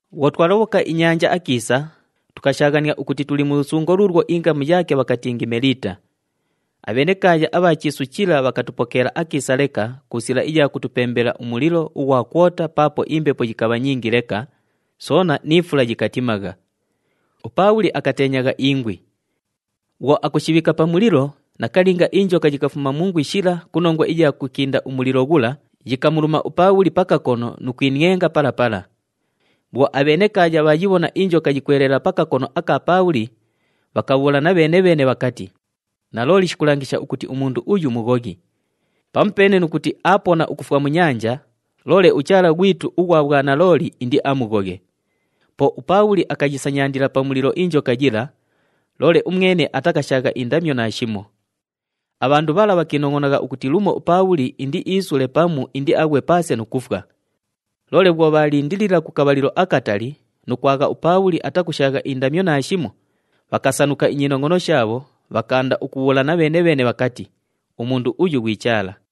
Bhwo twalobhoka inyanja akiisa, tukashaaghania ukuti tuli mu lusungo luulwo ingamu yaake bhakatingi Meliita. Abhenekaaya abha chiisu chila bhakatupokeela akiisa leka ku sila iya kutupembela umulilo ughwa kwota paapo imbepo yikabha nyingi leka, soona ni fula yikatimagha. UPaabhuli akateenyagha ingwi. Bhwo akushibhiika pa mulilo, nakalinga injoka yikafuma mu ingwi shila ku nongwa iya kukinda umulilo ghula, yikamuluma uPaabhuli pa kakono nu kwinienga pala pala. Bhwo abhenekaaya bhaayibhona injoka yikweleela pa kakono aka Paabhuli, bhakabhuulana bheene-bheene bhakati, “Nalooli shikulangisha ukuti umundu uyu mughoghi. Pamupeene nu kuti aapona ukufwa mu nyanja, loole uchaala ghwitu ughwa bhwanalooli indiamughoghe.” Po uPaabhuli akayisanyandila pa mulilo injoka yila, loole umwene atakashaagha indamyo naashimo. Abhandu bhala bhakiinongʼonagha ukuti lumo uPaabhuli indiisule pamu indiaghwe paase nu kufwa. Loole bhwo bhaalindilila ku kabhalilo akatali nu kwagha uPaabhuli atakushaagha indamyo naashimo, bhakasanuka inyinongʼono shaabho, bhakaanda ukubhuulana bheene-bheene bhakati, “Umundu uyu ghwi chaala.”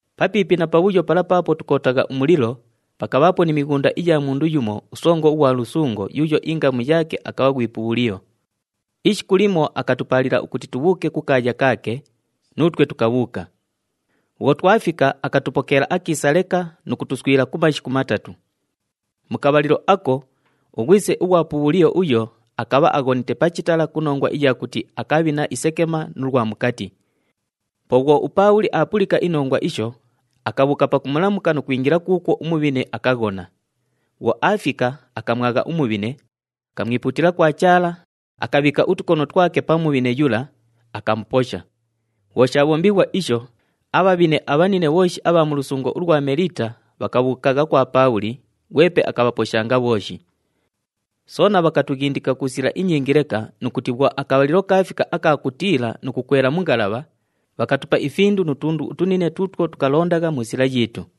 Papiipi na pabhuyo pala paapo tukootagha umulilo, pakabhaapo ni mighunda iya mundu yumo usongo ughwa lusungo yuuyo ingamu yaake akabha ghwi Pubhuliyo. Ishiku limo akatupaalila ukuti tubhuuke kukaaya kaake, nuutwe tukabhuuka. Bhwo twafika, akatupokeela akiisa leka nu kutuswila ku mashiku matatu. Mu kabhalilo ako, ughwise ughwa Pubhuliyo uyo akabha aghonite pa chitala ku nongwa iya kuti akabhina isekema nu lwa mukati. Po bhwo uPaabhuli aapulika inongwa isho, akabhuuka pakumulamuka nu kwingila kuukwo umubhine akaghona. Bhwo aafika, akamwagha umubhine, akamwipuutila kwa Chaala, akabhiika utukono twake pa mubhine yula, akamuposha. Bhwo shaabhombighwa isho, abhabhine abhanine bhooshi abha mu lusungo ulwa Meliita bhakabhuukagha kwa Paabhuli, ghwepe akabhaposhanga bhooshi. Soona bhakatughindika ku sila inyingi leka nu kuti bhwo akabhalilo kaafika aka kutiila nu kukwela mu ngalabha, bhakatupa ifindu nu tundu utunine tuutwo tukalondagha mu sila yiitu.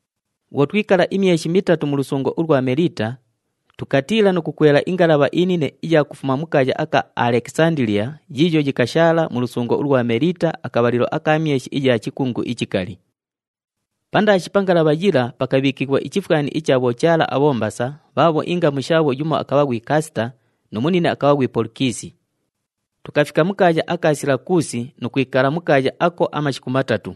Bhwo twikala imyeshi mitatu mu lusungo ulwa Meliita, tukatiila nu kukwela ingalabha inine iya kufuma mu kaaya aka Alekisandiliya yiiyo yikashaala mu lusungo ulwa Meliita akabhalilo aka myeshi iya chikungu ichikali. Pandaashi pa ngalabha yila pakabhiikighwa ichifwani icha bhochaala abhombasa bhaabho ingamu shaabho yumo akabha ghwi Kasita nu munine akabha ghwi Polukisi. Tukafika mu kaaya aka Silakuusi nu kwikala mu kaaya ako amashiku matatu.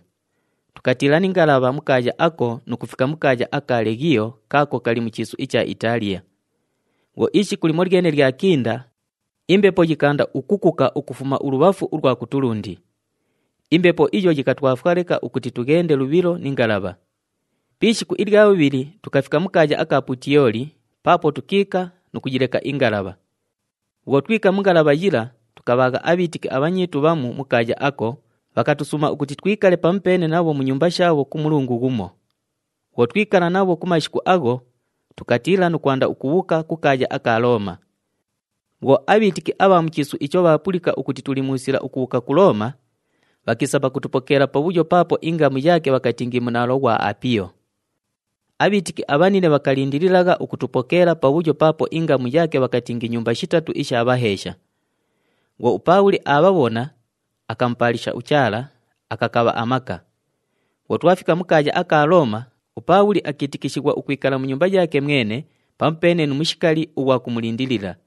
Tukatiila ni ngalabha mu kaaya ako nu kufika mu kaaya aka Leghiyo kaako kali mu chiisu icha Itaaliya. Bhwo ishiku limolyene lyakinda, imbepo yikaanda ukukuka ukufuma ulubhafu ulwa kutulundi. Imbepo iyo yikatwafwa leka ukuti tughende lubhilo ni ngalabha. Pi ishiku ilya bhubhili, tukafika mu kaaya aka Putiyoli paapo tukiika nu kuyileka ingalabha. Bhwo twika mu ngalabha yila, tukabhaagha abhiitiki abhanyiitu bhamu mu kaaya ako, bhakatusuuma ukuti twikale pamupeene nabho mu nyumba shaabho ku mulungu ghumo. Bhwo twikala nabho ku mashiku agho, tukatiila nu kwanda ukubhuuka ku kaaya aka Looma. Bhwo abhiitiki abha mu chiisu icho bhaapulika ukuti tuli mu sila ukubhuuka ku Looma, bhakiisa pakutupokeela pabhuyo paapo ingamu yaake bhakatingi Munaalo ghwa Apiyo. Abhiitiki abhanine bhakalindililagha ukutupokeela pabhuyo paapo ingamu yaake bhakatingi Nyumba Shitatu isha Bhaheesha. Bhwo uPaabhuli aabhabhona, akamupaalisha uChaala, akakabha amaka. Bhwo twafika mu kaaya aka Looma, uPaabhuli akiitikishighwa ukwikala mu nyumba yaake mwene pamupeene nu mushikali ughwa kumulindilila.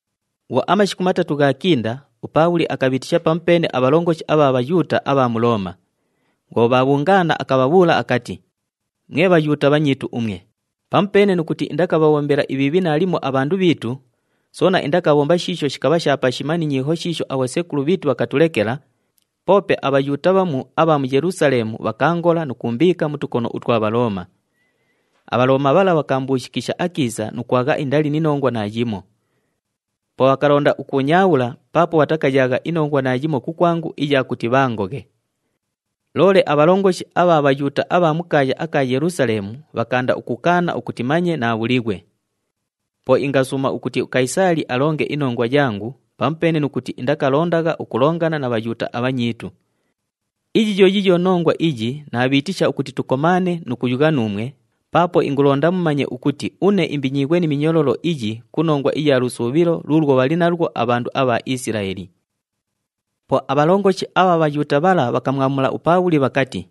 Bhwo amashiku matatu ghaakinda, uPaabhuli akabhiitisha pamupeene abhalongoshi abha Bhayuuta abha mu Looma. Bhwo bhaabhungaana, akabhabhuula akati, “Mwe Bhayuuta bhanyiitu umwe, pamupeene nu kuti indakabhabhombela ibhiibhi naalimo abhandu bhiitu, soona indakabhomba shiisho shikabha pashima ni nyiiho shiisho abhosekulu bhiitu bhakatulekela, poope aBhayuuta bhamu abha mu Yelusaleemu bhakaangola nu kuumbiika mu tukono utwa Bhalooma. ABhalooma bhala bhakaambuushikisha akiisa nu kwagha indali ni nongwa naayimo. Po bhakalonda ukuunyaabhula paapo bhatakayaagha inongwa naayimo kukwangu iya kuti bhaangoghe. Loole abhalongoshi abha Bhayuuta abha mu kaaya aka Yelusaleemu bhakaanda ukukaana ukuti manye naabhulighwe. Po ingasuuma ukuti uKayisaali alonge inongwa yangu pamupeene nu kuti indakalondagha ukulongana na Bhayuuta abhanyiitu. Iyi yo yiiyo nongwa iyi naabhiitisha ukuti tukomaane nu kuyugha nuumwe paapo ingulonda mumanye ukuti une imbinyiighwe ni minyololo iyi ku nongwa iya lusuubhilo luulwo bhali nalwo abhandu abha Isilaeli.” Po abhalongoshi abha Bhayuuta bhala bhakamwamula uPaabhuli bhakati,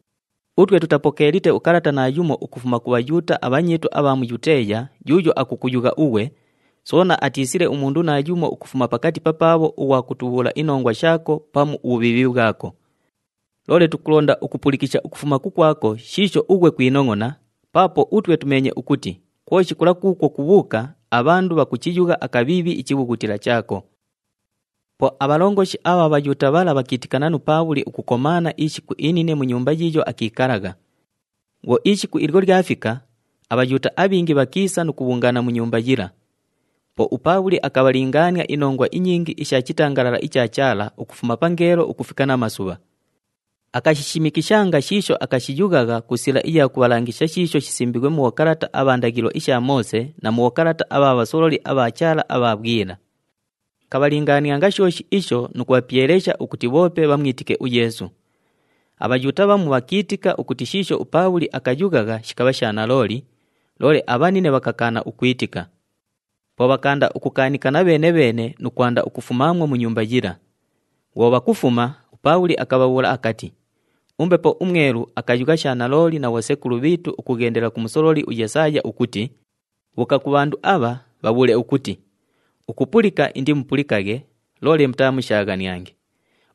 “Utwe tutapokeelite ukalata naayumo ukufuma ku Bhayuuta abhanyiitu abha mu Yuteeya yuuyo akukuyugha ughwe, soona atiisile umundu naayumo ukufuma pakati papaabho ughwa kutubhuula inongwa shaako pamu ubhubhiibhi bhwako. Loole tukulonda ukupulikisha ukufuma kukwako shiisho ughwe kwinongʼona paapo utwe tumeenye ukuti kwoshi kula kuukwo kubhuuka abhandu bhakuchiyugha akabhiibhi ichibhughutila chaako.” Po abhalongoshi abha Bhayuuta bhala bhakiitikana nu Paabhuli ukukomaana ishiku inine mu nyumba yiiyo akiikalagha. Bhwo ishiku ilyo lyafika, aBhayuuta abhingi bhakiisa nu kubhungaana mu nyumba yila. Po uPaabhuli akabhalingaania inongwa inyingi isha chitangalala icha Chaala ukufuma pangeelo ukufika namasubha. Akashishimikishanga shiisho akashiyughagha ku sila iya kubhalangisha shiisho shisimbiighwe mu bhokalata abha ndaghilo isha Moose na mu bhokalata abha bhasololi abha Chaala abha bhwila. Akabhalingaanianga shooshi isho nu kubhapyelesha ukuti bhoope bhamwitike uYeesu. ABhayuuta bhamu bhakiitika ukuti shiisho uPaabhuli akayughagha shikabha sha nalooli, loole abhanine bhakakaana ukwitika. Po bhakaanda ukukaanikana bheene-bheene nu kwanda ukufumaamwo mu nyumba yila. Bhwo bhakufuma, uPaabhuli akabhabhuula akati, “UMbepo uMwelu akayugha sha nalooli na bhosekulu bhiitu ukughendela ku musololi uYesaaya ukuti, ‘Bhuuka ku bhandu abha, bhabhuule ukuti, “Ukupulika indimupulikaghe, loole mutaamushaaghaniange.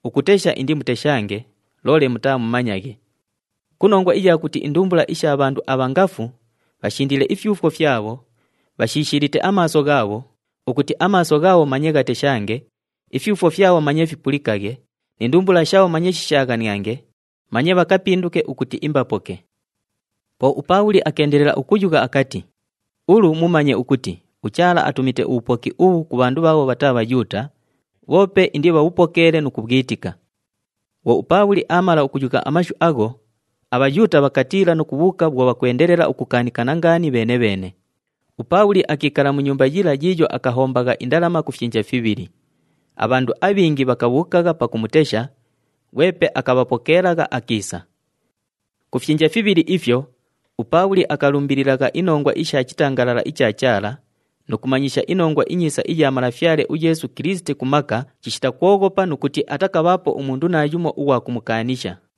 Ukutesha indimuteshange, loole mutaamumanyaghe. Ku nongwa iya kuti indumbula isha bhandu abha ngafu, bhashindiile ifyufwo fyabho, bhashishiilite amaaso ghaabho, ukuti amaaso ghaabho manye ghateshange, ifyufwo fyabho manye fipulikaghe ni ndumbula shaabho manye shishaaghaniange, manye bhakapinduke ukuti imbapoke.”’” Po uPaabhuli akeendelela ukuyugha akati, “Ulu mumanye ukuti uChaala atumite ubhupoki ubhu ku bhandu bhaabho bhataa Bhayuuta, bhoope indibhabhupokeele nu kubhwitika.” [ Bhwo uPaabhuli aamala ukuyugha amashu agho, aBhayuuta bhakatiila nu kubhuuka bhwo bhakwendelela ukukaanikana ngaani bheene-bheene.] UPaabhuli akiikala mu nyumba yila yiiyo akahombagha indalama ku fyinja fibhili. Abhandu abhingi bhakabhuukagha pakumutesha, ghwepe akabhapokeelagha akiisa. Ku fyinja fibhili ifyo, uPaabhuli akalumbililagha inongwa isha chitangalala icha Chaala nu kumanyisha iNongwa iNyiisa iya Malafyale uYeesu Kilisiti ku maka chishita kwoghopa nu kuti atakabhaapo umundu naayumo ughwa kumukaanisha.